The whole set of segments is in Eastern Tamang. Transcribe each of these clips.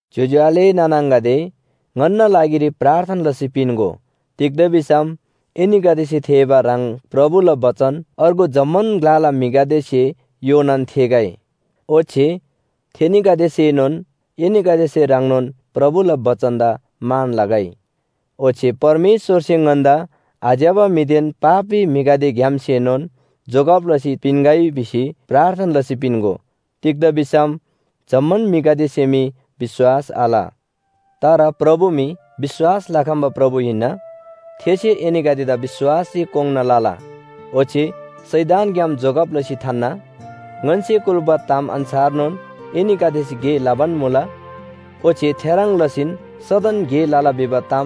ज्‍योज्‍यो आले नाना आङागदे, ङन्‍ना लागिरी प्रार्थना लसी पिन्‍गो, तिग्‍दा भिसम एनीगदेसे थेःबा ह्रङ् प्रभुला बचन अर्गु जम्‍मान ग्‍लाला म्‍हिगदेसे योनान थेःगै। ओच्‍छे थेनीगदेसेनोन एनीगदेसे ह्रङ्नोन प्रभुला बचनदा मान लगै। ओच्‍छे परमेश्‍वरसे ङन्‍दा आज्‍यबा म्‍हिदेन पापी म्‍हिगदेग्‍यामसेनोन जोगब लसी पिन्‍गै भिसी प्रार्थना लसी पिन्‍गो। तिग्‍दा भिसम जम्‍मान म्‍हिगदेसे मी विश्‍वास आल। तर प्रभु मी विश्‍वास लखम्‍बा प्रभु हिन्‍ना। थेसे एनीगदेदा विश्‍वासरी कोङ्‌ना लला ओच्‍छे शैतानग्‍याम जोगब लसी थान्‍ना। ङन्‍से कुल्‍बा ताम अन्‍छारनोन एनीगदेसे गे लबान मुला। ओच्‍छे थेह्रङ् लसीन सदन गे लला भिबा ताम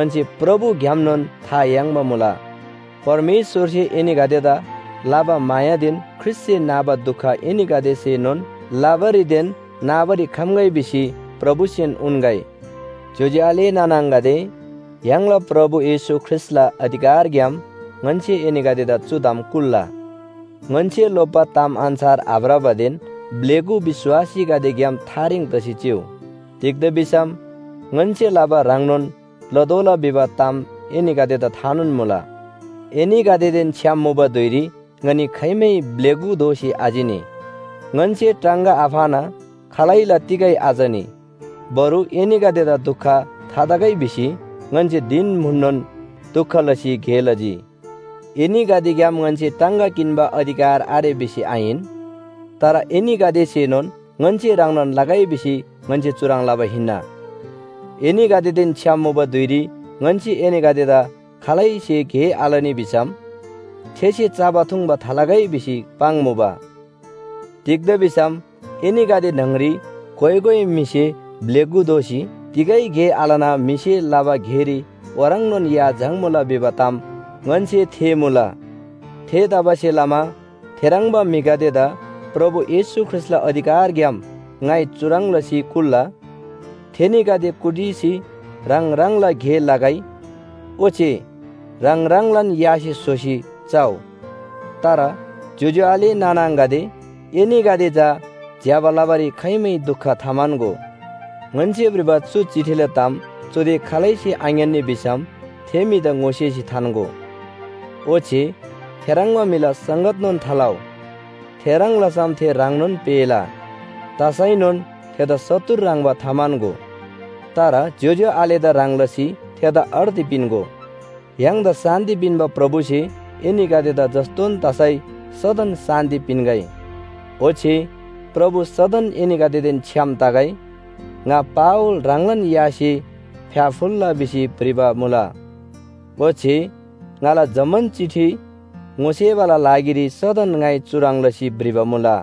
ङन्‍से प्रभुग्‍यामनोन था याङ्बा मुला। परमेश्‍वरसे एनीगदेदा लबा मायादेन ख्रीष्‍टसे नाबा दुख एनीगदेसेनोन लबारीदेन नाबारी खम्‍गै भिसी प्रभुसेन उन्‍गै। ज्‍योज्‍यो आले नाना आङागदे, य्‍हाङला प्रभु येशू ख्रीष्‍टला अधिकारग्‍याम ङन्‍से एनीगदेदा चु ताम कुल्‍ला। ङन्‍से लोप्‍बा ताम अन्‍छार आभ्रबादेन ब्‍लेगु विश्‍वासीगदेग्‍याम थारेङ तसी चिउ। तिग्‍दा भिसम ङन्‍से लबा ह्रङ्नोन लतोःला भिबा ताम एनीगदेदा थानोन मुला। एनीगदेदेन छ्‌याम मुबा धुइरी ङनी खाइमै ब्‍लेगु दोसी आचिनी। ङन्‍से टाङगा आफाना खालैला तिगै आचनी, बरु एनीगदेदा दुख थातगै भिसी ङन्‍से धिन म्‍हुननोन दुख लसी गे लजी। एनीगदेग्‍याम ङन्‍से टाङगा किन्‍बा अधिकार आरे भिसी आहिन, तर एनीगदेसेनोन ङन्‍से ह्रङ्नोन लगै भिसी ङन्‍से चुह्रङ् लबा हिन्‍ना। एनीगदेदेन छ्‌याम मुबा धुइरी ङन्‍से एनीगदेदा “खालैसे गे आलनी भिसम थेसे चबा थुङ्बा थालगै” भिसी पाङ्मुबा। तिग्‍दा भिसम एनीगदे न्‍हङरी कोइ कोइ म्‍हिसे ब्‍लेगु दोसी तिगै गे आलना म्‍हिसे लबा गेरी ओह्रङ्नोन या झाङ्मुला भिबा ताम ङन्‍से थेःमुला। थेतबासेलमा थेह्रङ्बा म्‍हिगदेदा प्रभु येशू ख्रीष्‍टला अधिकारग्‍याम ङाइ चुह्रङ् लसी कुल्‍ला। थेनीगदे कुटिसी ह्राङ ह्राङला गे लगै ओच्‍छे ह्राङ ह्राङलान यासे स्‍होसी चउ। तर ज्‍योज्‍यो आले नाना आङागदे, एनीगदे चा ज्‍यबा लबारी खाइमै दुख थाम्‍हन्‍गो। ङन्‍से भ्रिबा चु चिठीला ताम चुदे खालैसे आङ्‌यान्‍नी भिसम थे म्‍हिदा ङोसेसी थान्‍गो, ओच्‍छे थेह्रङ्बा म्‍हिला संगतनोन थालउ। थेह्रङ् लसम थे ह्राङनोन पेःला। तसैनोन थेदा शत्रु ह्रङ्‌बा थाम्‍हन्‍गो, तर ज्‍योज्‍यो आलेदा ह्रङ् लसी थेदा अर्ती पिन्‍गो। य्‍हाङदा शान्‍ति पिन्‍बा प्रभुसे एनीगदेदा जस्‍तोन तसै सदन शान्‍ति पिन्‍गै। ओच्‍छे प्रभु सदन एनीगदेदेन छ्‌याम तगै। ङा पावल ह्राङलान यासे फ्‍याफुल्‍ला भिसी भ्रिबा मुला। ओच्‍छे ङाला जम्‍मान चिठी ङोसेबाला लागिरी सदन ङाइ चुह्रङ् लसी भ्रिबा मुला।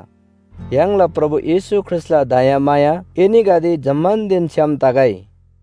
य्‍हाङला प्रभु येशू ख्रीष्‍टला दयामाया एनीगदे जम्‍मानदेन छ्‌याम तगै।